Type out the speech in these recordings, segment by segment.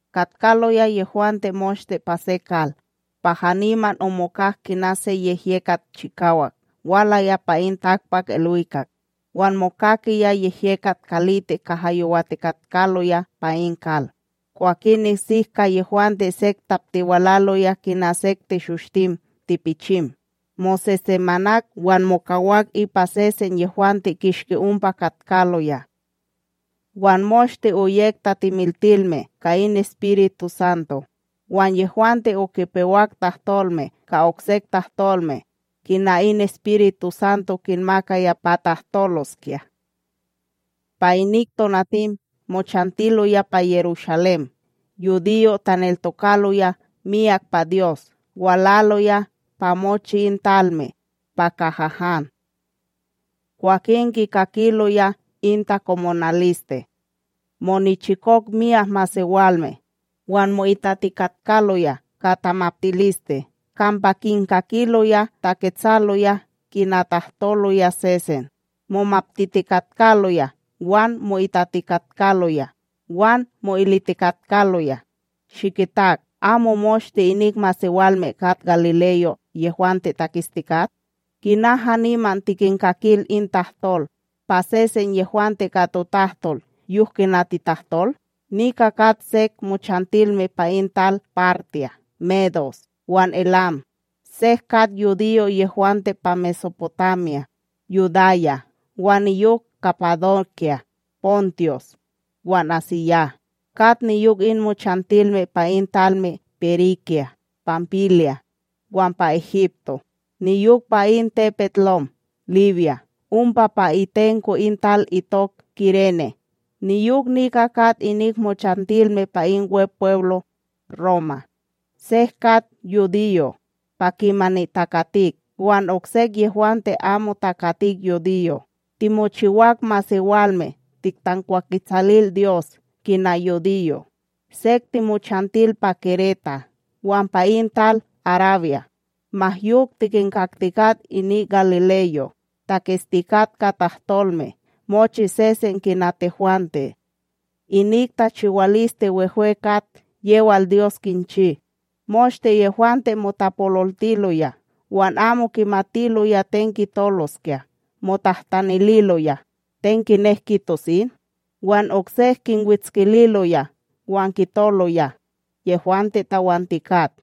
katkaloya yehwante moshte pa se kal. Pa haniman omokak kina se yehyekat chikawak, walaya pa in takpakIlwikak, wan mokakiyaya yehyekat kalitik kaha yowatikatkaloya pa in kal. Kwakin nesik ka yehwante sek taptiwalaloya kina sek teshoshtim tipichim, mosesemanak wan mokawak ipa sesen yehwante kishki ompa katkaloya. Wan moshte oyek tatimiltilme ka in EspirituSanto, wan yehwante okipewak tahtolme ka oksek tahtolme, kina in EspirituSanto kinmakaya pa tahtoloskya. Pa inik tonatim mochantiloya pa Yerushalém yudiyo' taneltokaloya miyak pa Dyos walaloya pa mochi in talme pa kaha han. Kwah kikakiloya in takomonaliste, monichikok myak masewalme wan mo'itatikatkaloya ka tamaptiliste kampa kinkakiloya taketsaloya kina tahtoloya sesen. Momaptitikatkaloya wan mo'itatikatkaloya, wan mo'ilitikatkaloya: —Shikitak. Amo moshte inik masewalme kat galileyo', yehwante taketstikat? Kina haniman, tikinkakil in tahtol pa sesen yehwante ka totahtol yok kina titahtol? Nika kat sek mochantilme pa in talme Partya, Medos, wan Elam. Sek kat yudiyo' yehwante pa MesoPotamya, Yudaya wan niyok Kapadokya, Pontos wan AsíYah, kat niyok in mochantilme pa in talme Perígya, Panpilya, wan pa Egipto, niyok pa in tepetLom Libya ompa pa itenko in tal itok Kirene. Niyok nika kat inik mochantilme pa in Wepweblo' Roma. Sek kat yudiyo', pa kimani takatik wan oksek yehwante amo takatik yudiyo', timochiwak masewalme tiktankwaketsalil Dyos kina yudiyo'. Sek timochantil pa Keréta wan pa in tal Arabya; ma yok tikinkaktikat inik galileyo' taketstikat ka totahtolme mochi sesen kina tehwante, inik tachiwaliste wehwe kat yewal Dyos kinchi. Moshte yehwante motapololtiloya wan amo kimatiloya ten kitoloskya, motahtanililoya: —Ten kinek kitos in? Wan oksek kinwetskililoya wan kitoloya: —Yehwante tawantikat.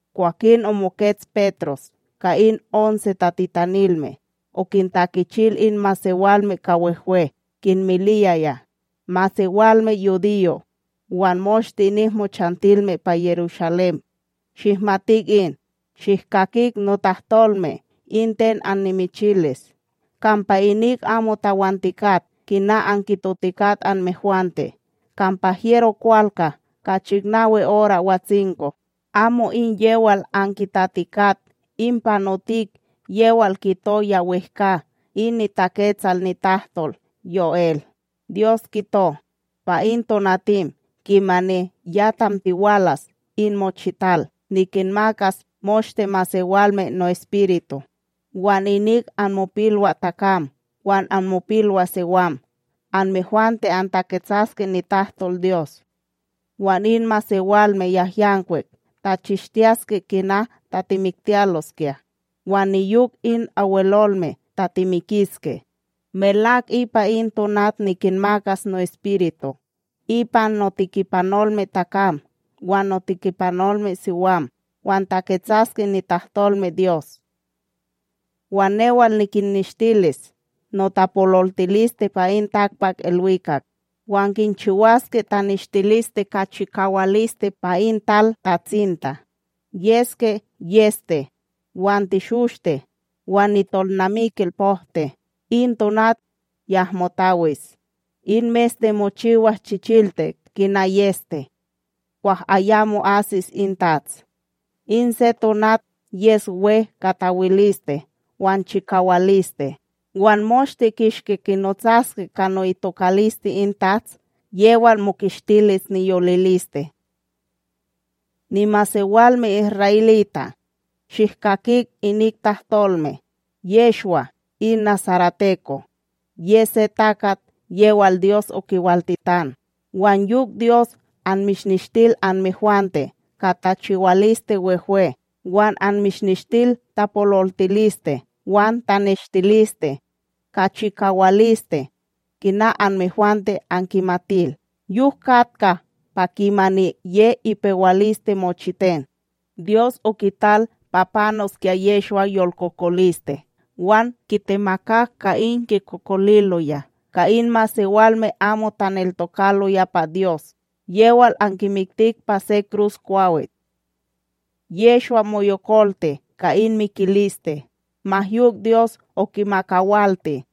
Kwakin omokets Petros ka in onse tatitanilme, okintakichil in masewalme ka wehwe, kinmiliyaya: —Masewalme yudiyo' wan moshte inik mochantilme pa Yerushalém, shihmatik in, shihkakik notahtolme in ten annimichilis. Kampa inik amo tawantikat, kina ankitotikat anmehwante, kampa hyero kwalka ka chiknawi ora watsinko. Amo in yewal ankitatikat, in panotik yewal kito ya wehkA in niTaketsal nitahtolDyos YoEl: Dyos kito, pa in tonatim kimani ya tamtiwalas in mochital, nikinmakas moshte masewalme no'Espiritu; wan inik anmopilwaTakam wan anmopilwaSiwam anmehwante antaketsaske nitahtolDyos, wan in masewalme yahyankwik tachishtiyaske kina tatimiktiyaloskya, wan niyok in Abwelolme tatimikiske. Melak ipa in tonat nikinmakas no'Espiritu ipa notekipanolmeTakam wan notekipanolmeSiwam, wan taketsaske nitahtolmeDyos. Wan newal nikinneshtilis notapololtiliste pa in takpakIlwikak, wan kinchiwaske taneshtiliste ka chikawaliste pa in talTatsinta: yeske yEste wan teshoshte wan nitolnamikil pokte. In tonat yahmo tawis, in meste mochiwas chichiltik kina yEste, kwah ayamo asis in TATS, in se tonat yes we ka tawiliste wan chikawaliste. Wan moshte kishki kinotsaske ka ni'itokaliste in Tats yewal mokistilis niyoliliste. ’Nimasewalme isra'elita', shihkakik inik tahtolme: Yehshwa, in nasareteko, ye se takat yewal Dyos okiwaltitan. Wan yok Dyos anmishneshtil anmehwante ka tachiwaliste wehwe wan annimishneshtil tapololtiliste wan taneshtiliste, ka chikawaliste kina anmehwante ankimatil. Yok katka pa kimani ye ipewaliste mochiten, Dyos okital pa panoskya Yehshwa yolkokoliste wan kitemakak ka in kikokoliloya ka in masewalme amo taneltokaloya pa Dyos, yewal ankimiktik pa se kruskwawit. Yehshwa moyokolti ka in mikiliste, ma yok Dyos okimakawalti;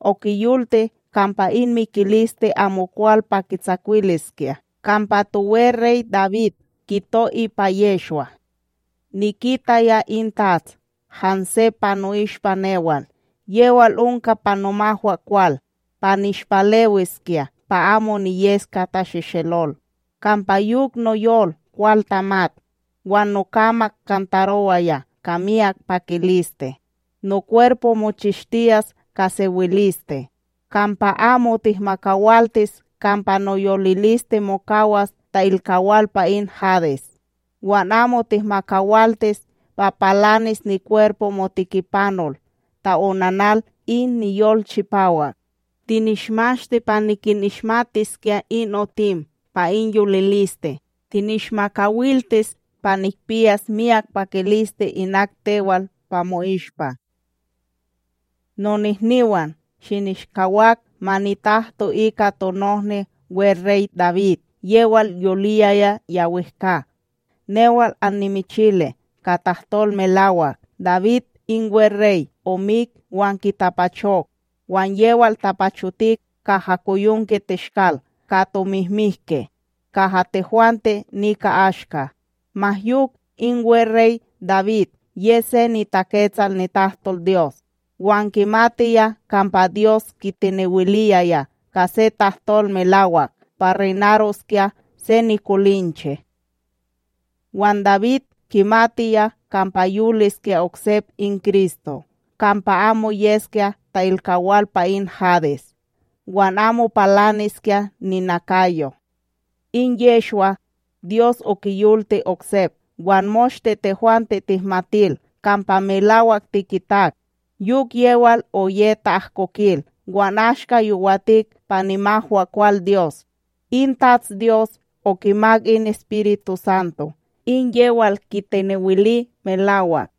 okiyolti kampa in mikiliste amokwal pa kitsakwiliskya. Kampa toweRey Dawid, kito ipa Yehshwa: Nikitaya in Tats hanse pa no'ishpa newal; yewal onka pa nomahwaKwal, pa nishpalewiskya pa amo niyeskya tatsehtselol. Kampa yok noyol kwal tamat, wan nokamak kantarowaya ka miyak pakiliste. Nokwerpo mochistiyas ka sewiliste; kampa amo tihmakawaltis kampa noyoliliste mokawas ta'ilkawal pa in Hades, wan amo tihmakawaltis pa palanis nikwerpo moTikipanol ta'onanal in niyol chipawak. Tinishmashti pa nikinishmatiskya in otim pa in yoliliste, tinishmakawiltis pa nikpiyas miyak pakiliste inak tewal pa mo'ishpa. ’Nonohniwan, shinishkawak ma nitahto ika tonohni weRey Dawid yewal yoliyaya ya wehkA. Newal annimichili ka tahtol melawak, Dawid in weRey omik wan kitapachok, wan yewal tapachotik kaha koyonkeTeshkal ka tomihmihke kaha tehwante nika ashka. Ma yok, in weRey Dawid ye se niTaketsal nitahtolDyos, wan kimatiya kampa Dyos kitenewiliyaya ka se tahtol melawak pa reynaroskya se nikolinche. Wan Dawid, kimatiya kampa yoliskya oksep in Kristo kampa amo yeskya ta'ilkawal pa in Hadesb wan amo palaniskya ninakayo. In Yehshwa, Dyos okiyolti oksep wan moshte tehwante tihmatil kampa melawak tikitak. Yok yewal oye ta'ahkokil wan ashka yowatik pa nimahwaKwal Dyos, in TatsDyos okimak in EspirituSanto in yewal kitenewili melawak;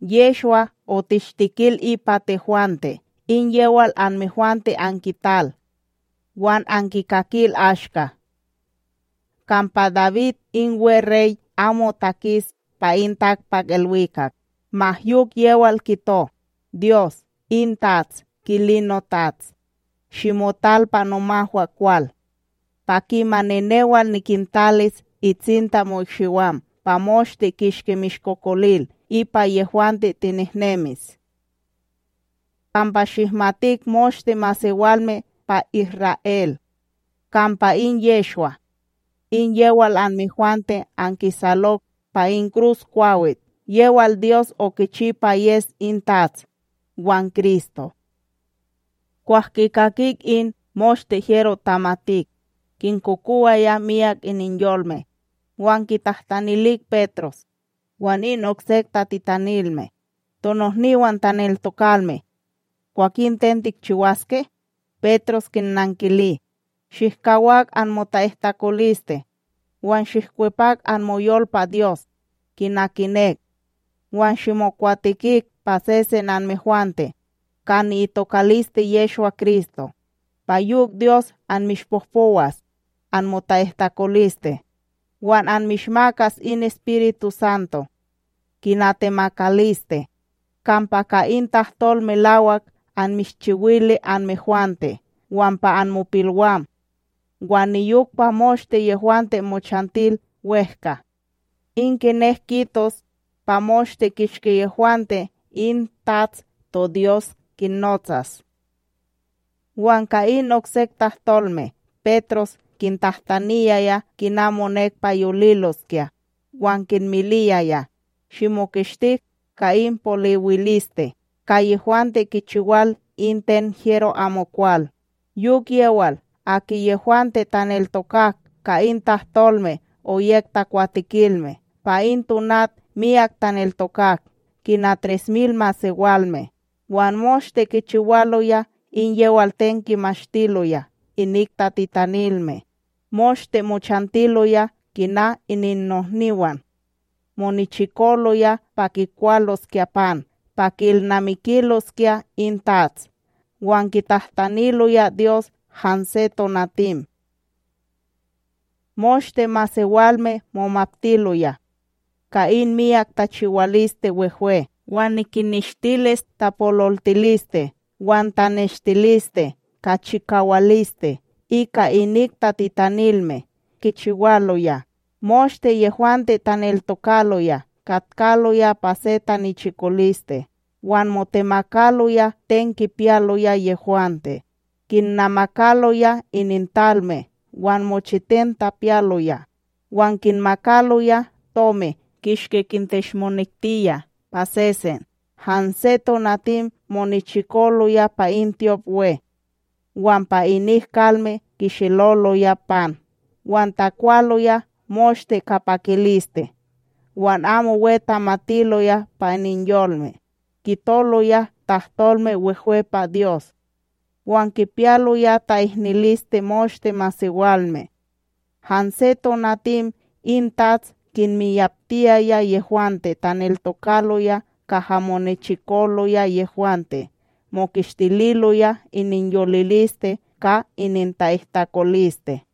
Yehshwa otishtikil ipa tehwante, in yewal anmehwante ankital wan ankikakil ashka. Kampa Dawid in weRey amo takis pa in takpakIlwikak; ma yok yewal kito: Dyos in TATS kili noTats: “Shimotal pa nomahwaKwal, pa kimani newal nikintalis itsinta mo'ikshiwam pa moshte kishki mishkokolil ipa yehwante tinehnemis.” ’Kampa shihmatik moshte masewalme pa Isra'El kampa in Yehshwa, in yewal anmehwante ankisalok pa in kruskwawit, yewal Dyos okichi pa yes in Tats wan Kristo. Kwah kikakik in, moshte hyero tamatik kinkokowaya miyak ininyolme, wan kitahtanilik Petros wan in oksek tatitanilme: —Tonohniwan taneltokalme, kwakin ten tikchiwaske? Petros kinnankili: —Shihkawak anmota'ihtakoliste wan shihkwepak anmoyol pa Dyos kina kinek, wan shimokwatekik pa sesen anmehwante ka ni'itokaliste Yehshwa-Kristo, pa yok Dyos anmishpohpowas anmota'ihtakoliste; wan anmishmakas in EspirituSanto kina temakaliste. Kampa ka in tahtol melawak anmishchiwili anmehwante wan pa anmopilwam, wan niyok pa moshte yehwante mochantil wEhka; in kinek kitos pa moshte kishki yehwante in Tats toDyos kinnotsas. Wan ka in oksek tahtolme, Petros kintahtaniyaya kina monek pa yoliloskya wan kinmiliyaya: —Shimokistik ka in poliwiliste ka yehwante kichiwal in ten hyero amokwal. Yok yewal, aki yehwante taneltokak ka in tahtolme oyek takwatekilme, pa in tonat miyak taneltokak kina yey mil masewalme. Wan moshte kichiwaloya in yewal ten kimashtiloya inik tatitanilme, moshte mochantiloya kina ininnohniwan, monichikoloya pa kikwaloskya pan pa ki'ilnamikiloskya in TATS wan kitahtaniloya Dyos hanse tonatim. Moshte masewalme momaptiloya, ka in myak tachiwaliste wehwe wan in kinneshtilis tapololtiliste wan taneshtiliste ka chikawaliste ika inik tatitanilme yewal kichiwaloya. Moshte yehwante taneltokaloya katkaloya pa se tanichikoliste wan motemakaloya ten kipiyaloya yehwante; kinnamakaloya inintalme wan mochiten tapiyaloya, wan kinmakaloya tomi kishki kinteshmonektiya pa sesen. Hanse tonatim monichikoloya pa in tyopWe, wan pa inik kalme kisheloloya pan wan takwaloya moshte ka pakiliste wan amo we tamatiloya pa ininyolme. Kitoloya tahtolme wehwe pa Dyos, wan kipiyaloya ta'ihniliste moshte masewalme; hanse tonatim in Tats kinmiyaptiyaya yehwante taneltokaloya kaha monechikoloya yehwante mokistililoya ininyoliliste ka ininta'ihtakoliste.